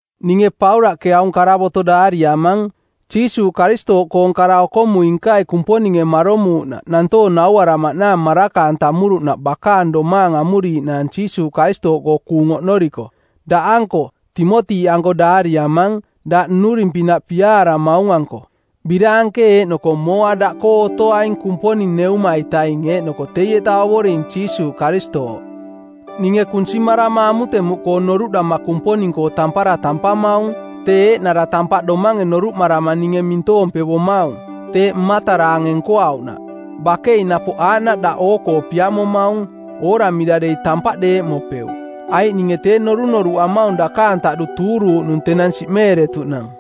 Ninge Paulaꞌke aung karavoto˜ daariamang, Jiisuuꞌ Karistooꞌkoong kara-okomui-nkai Kumponinge maromuuꞌnaꞌ nantoong nauaramaꞌnaang maraka-antamuruꞌnaꞌ bakaang domaang amuriiꞌnaang Jiisuuꞌ Karistooꞌkoo kuung oꞌnoriko. Daꞌanko, Timoti-anko daariamang, daꞌ nnuring-pinaꞌ piaaramaung-anko. Biraanke eeꞌnoko mooa daꞌkoo otoaing Kumponing Neuma-itaing eeꞌnoko teieta Ovoring Jiisuuꞌ Karistooꞌ. Ninge kunsimarama amutemuꞌkoo noruꞌdama Kumponing-koo tampara tampamaung, tee eeꞌnara tampaꞌ domange noruꞌmarama ninge mintoompevomaung, teeꞌ mmataraange nkoauꞌnaꞌ. Bakei napoꞌ aaꞌnaꞌ daꞌ oo-koo piamomaung, ooramira dei tampaꞌ deeꞌmopeuꞌ, aiꞌ ninge tee norunoruꞌamaung dakaang taꞌdu tuuruuꞌnung tenang siꞌmeeretuꞌnang.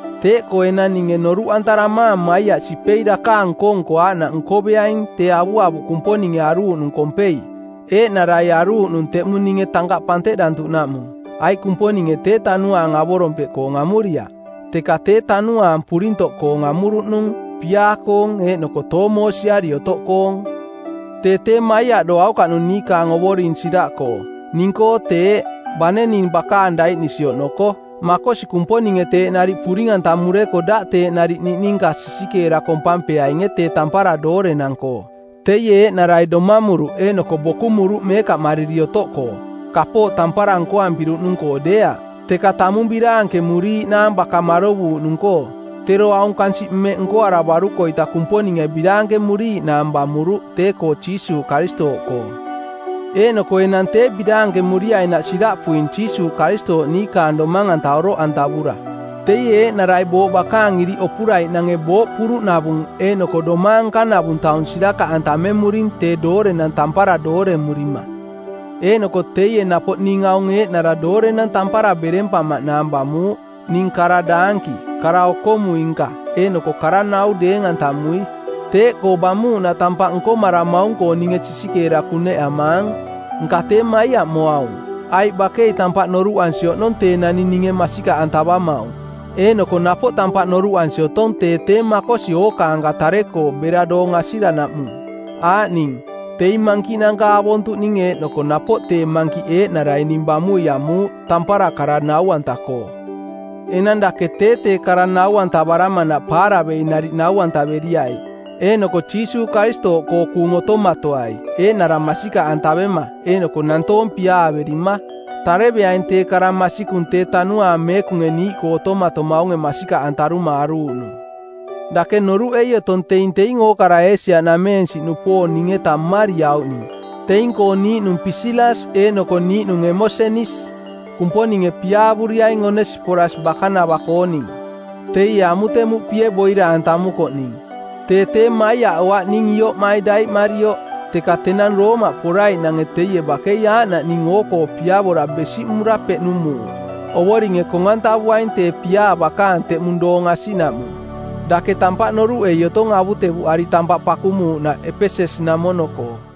Teeꞌkoo enang ninge noruꞌantaramaang maiaꞌ sipei dakaang nko-nko aaꞌnaꞌ nkoveaing tee avuavuꞌ Kumponinge aruuꞌnung kompei, eeꞌnarai aruuꞌnung teꞌmung ninge tankaꞌ panteꞌdantuꞌnaꞌmung. Aiꞌ Kumponinge tee tanuaang avorompeꞌkoong amuriaꞌ, teka tee tanuaang purintoꞌkoong amuruꞌnung, piaa-koong eeꞌnoko toomoosiari otoꞌkoong. Tee tee maiaꞌdoaukaꞌnung niikaang Ovoring siraꞌkoo; ning-koo teeꞌ, bane ning bakaang daiꞌnisi oꞌnoko. Makosi Kumponinge teeꞌ nariꞌ puring-antamureko daꞌ teeꞌ nariꞌ niꞌninka sisikeera kompampeainge tee tampara doorenang-koo. Teie eeꞌnarai domamuruꞌ eeꞌnoko bokumuruꞌ meekaꞌmariri otoꞌkoo, kapooꞌ tampara nkoampiruꞌnung-koo deeaꞌ, teka tamung biraankemuriiꞌnaang baka marovuuꞌnung-koo. Tero aung kansiꞌ mmeꞌ nkoaravaruko-ita Kumponinge biraankemuriiꞌnaang bamuruꞌ tee-koo Jiisuuꞌ Karistooꞌkoo. Eeꞌnoko enang tee biraankemuriainaꞌ siraꞌpuing Jiisuuꞌ Karistooꞌ niikaang domang-anta oroꞌantavura. Teie eeꞌnarai booꞌ bakaang iriꞌ opuraiꞌnange booꞌ puruꞌnavung eeꞌnoko domaang nkanavung taung sirakaꞌantamemuring tee doorenang tampara dooremurima. Eeꞌnoko teie napoꞌ ning aung eeꞌnara doorenang tampara berempamaꞌnaang bamuuꞌ, ning kara-daanki, kara-okomui-nka eeꞌnoko kara-nau deeng-antamui. Teeꞌkoo bamuuꞌnaꞌ tampaꞌ nkomaramaung-koo ninge sisikeera kuneꞌamaang. Nka tee maiaꞌmoaung, aiꞌ bakei tampaꞌ noruꞌansi oꞌnong tee naning ninge masikaꞌantavamaung, eeꞌnoko napoꞌ tampaꞌ noruꞌansi otong tee tee makosi ookaanka tare-koo bera doong asiranaꞌmung, aaꞌning: teing mankiꞌnanka avontuꞌning eeꞌnoko napoꞌ tee mankiꞌ eeꞌnarai ning bamui amuuꞌ, tampara kara nau-anta-koo. Enang dake tee tee kara nau-antavaramanaꞌ paaravei nariꞌ nau-antaveriai, eeꞌnoko Jiisuuꞌ Karistooꞌkoo kuung otomatoai eeꞌnara masikaꞌantavema eeꞌnoko nantoong piaaverima. Tareveaing tee kara masikung tee Tanuaang Meekunge niiꞌkoo otomatomaunge masikaꞌantaruma aruuꞌnung. Dake noruꞌei otong teing teing ookara Eesia-nameensiꞌnupoong ning-eta mmariauꞌning. Teing-koo niiꞌnung Pisilas eeꞌnoko niiꞌnung Emosenis. Kumponinge piaavuriaing Onesiporas bakanava-kooning, teie amutemuꞌpie boira-antamukoꞌ ning. Tee tee maiaꞌoaꞌ ning ioꞌmai daiꞌmarioꞌ, teka tenang Roomaꞌ poraiꞌnange teie bakei aaꞌnaꞌ ning oo-koo piavora besiꞌmura peꞌnumuuꞌ. Ovoringe kong-antavuaing tee piaa bakaang teꞌmung doong asiꞌnaꞌmung. Dake tampaꞌ noruꞌei otong avutevuꞌari tampaꞌ pakumuuꞌnaꞌ Epeses-namono-koo.